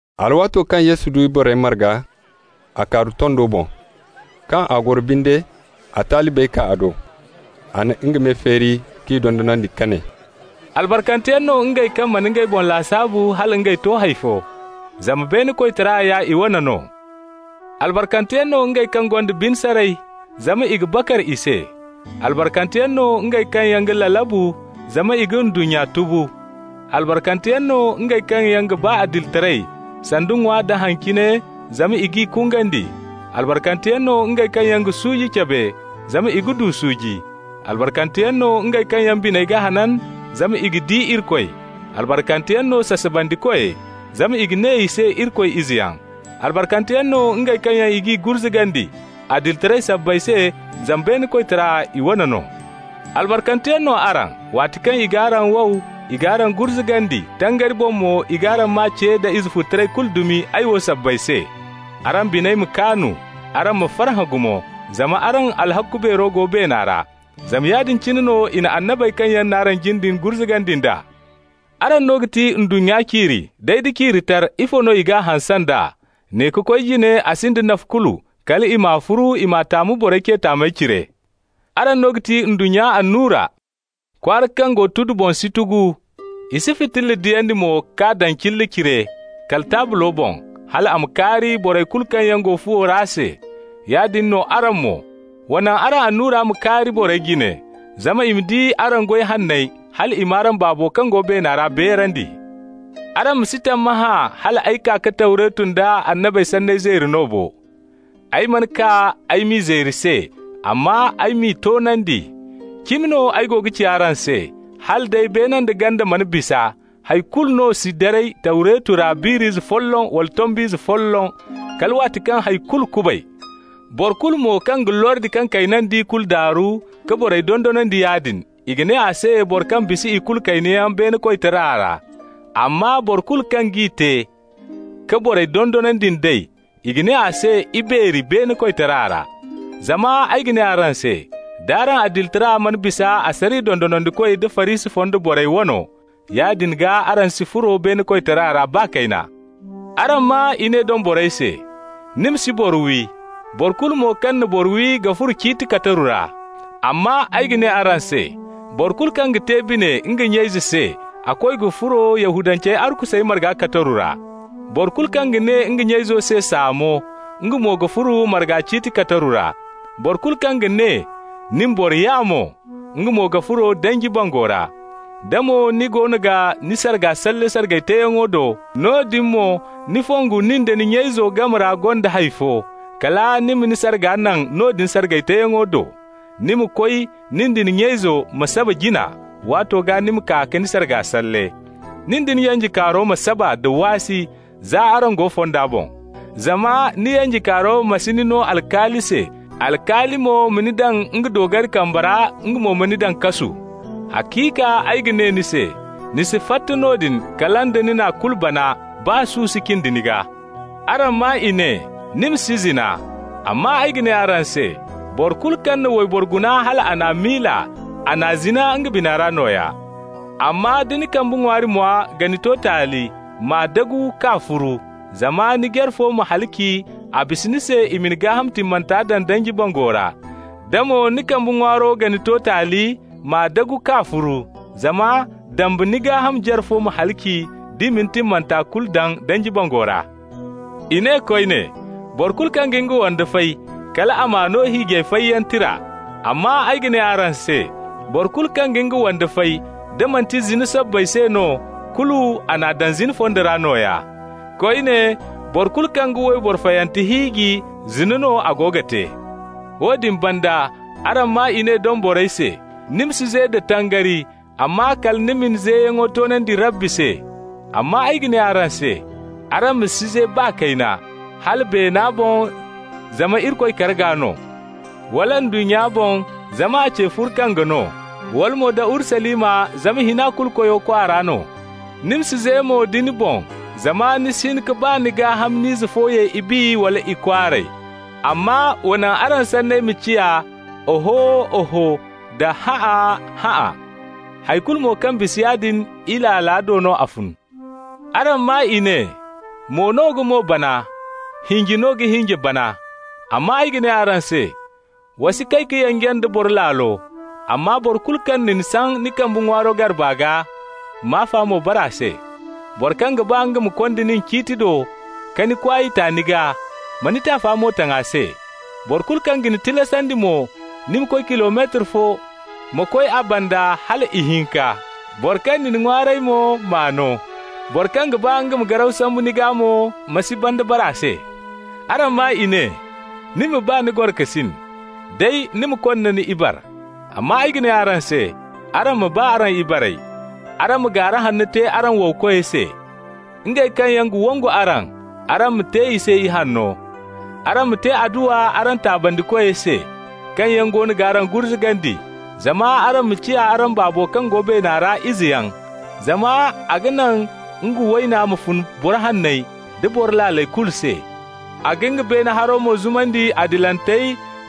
Alwaato kaŋ Yesu di borey marga, a kaaru tondo boŋ. Kaŋ a goro binde, a talibey kaa a do. A na nga me feeri k'i dondonandi ka ne: «Albarkanteyaŋ no ngey kaŋ mana ngey boŋ lasaabu hala ngey to hay fo, Zama beene koytara ya i wane no. Albarkanteyaŋ no ngey kaŋ gonda bine saray, Zama i ga bakar i se. Albarkanteyaŋ no ngey kaŋ yaŋ ga lalabu, Zama i ga ndunnya tubu. Albarkanteyaŋ no ngey kaŋ yaŋ ga ba adilitaray sanda ŋwa da haŋ cine, zama i g'i kungandi. Albarkanteyaŋ no ngey kaŋ yaŋ ga suuji cabe, Zama i ga du suuji. Albarkanteyaŋ no ngey kaŋ yaŋ biney ga hanan, Zama i ga di Irikoy. Albarkanteyaŋ no sasabandikoy, Zama i ga ne i se Irikoy izeyaŋ. Albarkanteyaŋ no ngey kaŋ yaŋ i g'i gurzugandi adilitaray sabbay se, zama beene koytara i wane no. Albarkanteyaŋ no araŋ, waati kaŋ i g'araŋ wow, i g'araŋ gurzugandi, tangari boŋ mo i g'araŋ maa ce da izefututaray kulu dumi, ay wo sabbay se. Araŋ biney ma kaanu, araŋ ma farhã gumo, zama araŋ alhakku beero go beena ra. Zama yaadin cine no i na annabey kaŋ yaŋ n'araŋ jin din gurzugandi nd'a. Araŋ no ga ti ndunnya ciiri, day da ciiri tar, ifo no i g'a hanse nd'a? Ne ka koy jine a sinda nafa kulu, kal i m'a furu, i m'a taamu borey ce taamey cire. Araŋ no ga ti ndunnya annura. Kwaara kaŋ go tudu boŋ si tugu. I si fitilla diyandi mo k'a daŋ cilla cire, kala taablo boŋ, hal a ma kaari borey kulu kaŋ yaŋ go fuwo ra se. Yaadin no araŋ mo. Wa naŋ araŋ annura ma kaari borey jine, zama i ma di araŋ goy hanney, hal i m'araŋ Baabo kaŋ go beena ra beerandi. Araŋ ma si tammahã hal ay kaa ka Tawretu nda annabey sanney zeeri no bo. Ay mana kaa ay m'i zeeri se, amma ay m'i toonandi. Cimi no ay go ga ci araŋ se: hala day beena nda ganda mana bisa, hay kulu no si daray Tawretu ra, biir'ize folloŋ wala tomb'ize folloŋ, kala waati kaŋ hay kulu kubay. Boro kulu mo kaŋ ga lordi kaŋ kayna d'i kulu daaru ka borey dondonandi yaadin, i ga ne a se boro kaŋ bisa ikulu kaynayaŋ beene koytara ra. Amma boro kulu kaŋ g'i te, ka borey dondonandi nd'ey, i ga ne a se ibeeri beene koytara ra. Zama ay ga ne araŋ se: d'araŋ adilitara mana bisa asariya dondonandikoy da Farisi fonda borey wano, yaadin gaa araŋ si furo beene koytara ra, baa kayna. Araŋ maa i ne doŋ borey se: ‹Ni ma si boro wi. Boro kulu mo kaŋ na boro wi ga furo ciiti kataru ra.› Amma ay ga ne araŋ se: boro kulu kaŋ ga te bine nga nya-ize se, a koy ga furo Yahudancey arkusey marga kataru ra. Boro kulu kaŋ ga ne nga nya-izo se saamo, nga mo ga furo marga ciiti kataru ra. Boro kulu kaŋ ga ne: ‹Nin, boro yaamo!› nga mo ga furo danji bango ra. Da mo ni goono ga ni sarga salle sargay teeyaŋo do, noodin mo ni fongu nin da ni nya-izo game ra gonda hay fo, kala ni ma ni sarga naŋ noodin sargay teeyaŋo do. Ni ma koy, nin da ni nya-izo ma saba jina, waato gaa ni ma kaa ka ni sarga salle. Nin da ni yanjekaaro ma saba nda waasi, za araŋ go fonda boŋ. Zama ni yanjekaaro ma si ni no alkaali se, alkaali mo ma ni daŋ nga doogari kambe ra, nga mo ma ni daŋ kasu. Haciika ay ga ne ni se: ni si fatta noodin kala da ni n'a kulu bana, baa su si cindi ni gaa. Araŋ maa i ne: ‹Ni ma si zina.› Amma ay ga ne araŋ se: boro kulu kaŋ na wayboro guna hal a n'a miila, a n'a zina nga bina ra nooya. Amma da ni kambe ŋwaari mwa ga ni to taali, m'a dagu k'a furu. Zama ni jare fo ma halaci, a bisa ni se i ma ni gaaham timmanta daŋ danji bango ra. Da mo ni kambe ŋwaaro ga ni to taali, m'a dumbu k'a furu. Zama dambe ni gaaham jare fo ma halaci, d'i m'a timmanta kulu daŋ danji bango ra. I ne koyne: ‹Boro kulu kaŋ ga nga wande fay, kal a m'a no hiijay fayyaŋ tira.› Amma ay ga ne araŋ se: boro kulu kaŋ ga nga wande fay, da manti zina sabbay se no, kulu a n'a daŋ zina fonda ra nooya. Koyne, boro kulu kaŋ ga wayboro fayante hiiji, zina no a go ga te. Woodin banda, araŋ maa i ne doŋ borey se: ‹Ni ma si ze da tangari, amma kala ni ma ni zeyaŋo toonandi Rabbi se.› Amma ay ga ne araŋ se: araŋ ma si ze baa kayna. Hala beena boŋ zama Irikoy karga no, wala ndunnya boŋ, zama a ce furkange no, wala mo da Urusalima, zama Hina-Kulu-Koyo kwaara no. Ni ma si ze mo da ni boŋ, zama ni si hin ka baa ni gaa-hamni ize fo ye ibi wala ikwaaray. Amma wa naŋ araŋ sanney ma ciya: Oho, oho da hã'a, hã'a. Hay kulu mo kaŋ bisa yaadin, Ilaala do no a fun. Araŋ maa i ne: ‹Mo no ga mo bana, hinje no ga hinje bana.› Amma ay ga ne araŋ se: wa si kay ka yanje nda boro laalo. Amma boro kulu kaŋ na ni saŋ ni kambe ŋwaari garba gaa, m'afa mo bare a se. Boro kaŋ ga ba nga ma konda nin ciiti do ka ni kwaay ta ni gaa, ma ni taafa mo taŋ a se. Boro kulu kaŋ ga ni tilasandi mo ni ma koy kilometar fo, ma koy a banda hala ihinka. Boro kaŋ na ni ŋwaaray mo, m'a no. Boro kaŋ ga ba nga ma garaw sambu ni gaa mo, ma si banda bare a se. Araŋ maa i ne: ‹Ni ma ba ni gorokasin, day ni ma konna ni ibare.› Amma ay ga ne araŋ se: araŋ ma ba araŋ ibarey. Araŋ ma gaara hanno te araŋ wowkoy se. Ngey kaŋ yaŋ ga wangu araŋ, araŋ ma te i se ihanno. Araŋ ma te adduwa araŋ taabandikoy se, kaŋ yaŋ goono g'araŋ gurzugandi, zama araŋ ma ciya araŋ Baabo kaŋ go beena ra izeyaŋ. Zama a ga naŋ nga wayna ma fun boro hanney da boro laaley kulu se, a ga nga beene haro mo zumandi adilantey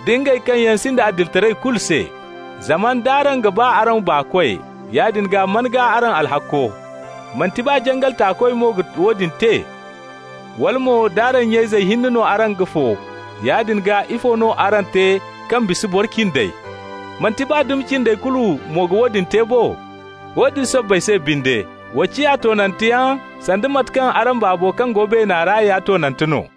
da ngey kaŋ yaŋ sinda adilitaray kulu se. Zama nd'araŋ ga ba araŋ baakoy, yaadin gaa man gaa araŋ alhakko? Manti baa jangal taakoy mo ga woodin te? Wala mo, d'araŋ nya-izey hinne no araŋ ga fo, yaadin gaa ifo no araŋ te kaŋ bisa boro cindey? Manti baa dumi cindey kulu mo ga woodin te bo? Woodin sabbay se binde, wa ciya toonanteyaŋ sanda mate kaŋ araŋ Baabo kaŋ go beena ra ya toonante no.